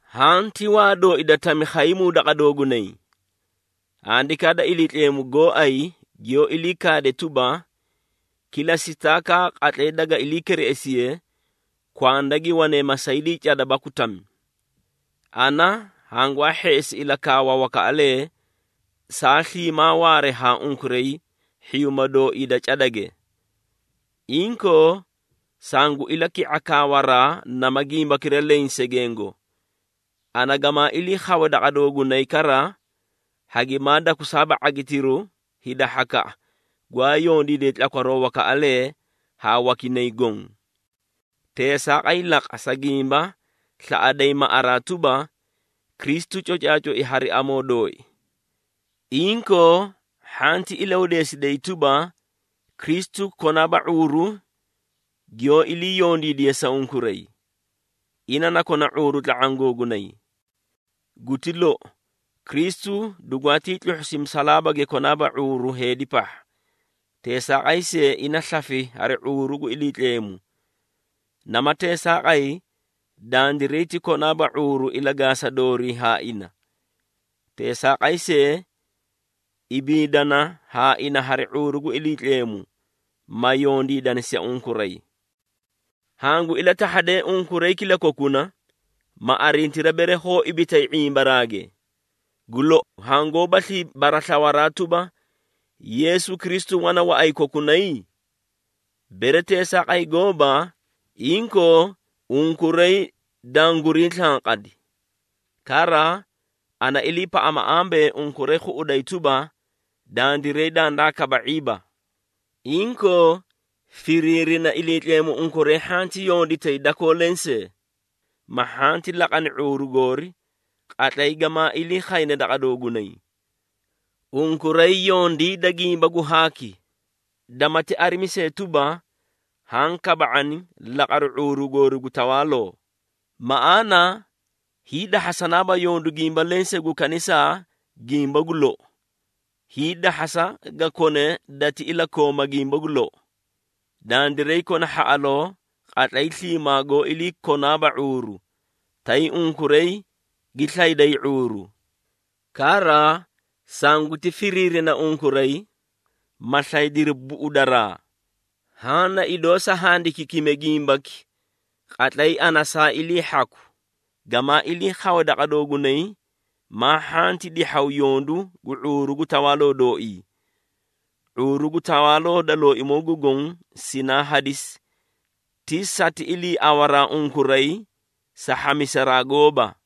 Haã ti waa dooi da tami khaymuu daqa doogunay. Handikaa da Iliitleemu gooay giyoó ilii kaade tuba, “Kila sitaakaa qatlay daga ilii kireꞌesiye kwanda gi wanee masaydii cada baku tami.” Ana hangwaa hheꞌesi ilakaawa wakaꞌalee saa sliimaa waare haa unkuray hhiyuuma dooii da cadage. Inkoo, sangu ilaki⁄a kaawaraa nama gimbakira leẽ segengo. Ana gamaa ilii khawe daqa doogunay kara, hagimaa dakusaaba ⁄agitiru hida hhakaꞌa, gwaa yondiidee tlakwaroo wakaꞌalee haa wakinay goõ. Teesaaqay laqa, sa gimba slaꞌaday maꞌaraa tuba, Kristu cocaacoi hari amoo dooi. Inkoo, hhanti ilahudeesiday tuba, Kristu konaaba ⁄uuru giyoó ilii yondiidiye sa unkuray. Ina na kona ⁄uuru tla⁄aã googunay. Guti lou, Kristu dugwaatii tluhhusi musalaabage konaaba ⁄uuru heedi pahha, teesaaqay see ina slafi hari ⁄uuru gu Iliitleemu. Nama teesaaqay, dandiray ti konaaba ⁄uuru ilagaasa doorii haa ina. Teesaaqay see, ibiidana haa ina hari ⁄uuru gu Iliitleemu, ma yondiidani sa unkuray. Hangu ilatahhadee unkuray kilakokuna, ma arintiri bere hoó ibitay ⁄imbaraage. Gu lou, hangoóbaslii baraslawaraa tuba, Yeesu Kristu wana waꞌay kokunay? Bere teesaaqay gooba, inkoo unkuray dangurii slanqadi! Kara, ana iliipaꞌama ambee, unkuray khuꞌuday tuba, dandiray dandaa kaba⁄iiba. Inkoo, firiirina Iliitleemu unkuray hhanti yonditay dakoo lensee, ma hhanti laqani ⁄uuru goori qatlay gamaa ilii khayne daqa doogunay. Unkuray yondiida gimba gu haaki, damati arimi see tuba, haã kaba⁄ani laqaru ⁄uuru goori gu tawaaloo. Maꞌaana, hiidahhasanaabaa yondu gimba lensee gu kanisa gimba gu lou. Hiidahhasa ga kone dati ilakooma gimba gu lou. Dandiray kona hhaꞌaloo qatlay sliimaa goó ilii konaaba ⁄uuru, tay unkuray gi slayday ⁄uuru. Kara, sanguti firiirina unkuray, ma slaydiri buꞌudaraa. Haã na idoo sa handikiikime gimbaki qatlay ana saa ilii hhaku, gamaa ilii khawe daqa doogunay, maa hhanti dihhaw yondu gu ⁄uuru gu tawaaloo dooii. ⁄uuru gu tawaaloo da Looimoo gu Goõ sinaa hadisi, ti sati iliiawaraa unkuray, sa hhamisaraa gooba.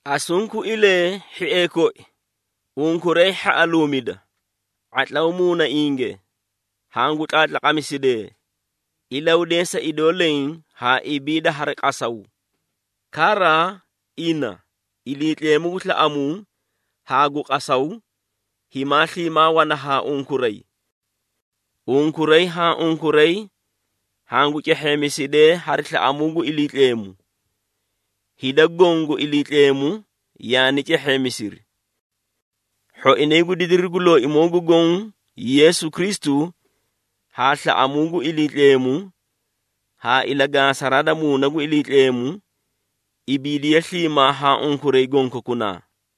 Asunkuilee, hhiee koi, unkuray hhaꞌaluumida, ⁄atlaw muunainge, hangu tlaatlaqamisidee, ilahudeesa idoo leẽ haa ibiida hari qasaw. Kara, ina, Iliitleemu gu slaꞌamuu haa gu qasaw, himaa sliimaa wana haa unkuray. Unkuray haa unkuray hangu cehheemisidee hari slaꞌamuu gu Iliitleemu. Hida goõ gu Iliitleemu yaani cehheemisiri. Hhoinay gu didiru gu Looimoo gu Goõ Yeesu Kristu, haa slaꞌamuu gu Iliitleemu, haa ilagaasaraa da Muuna gu Iliitleemu, ibiidiye sliimaa haa unkuray gonkokunaa.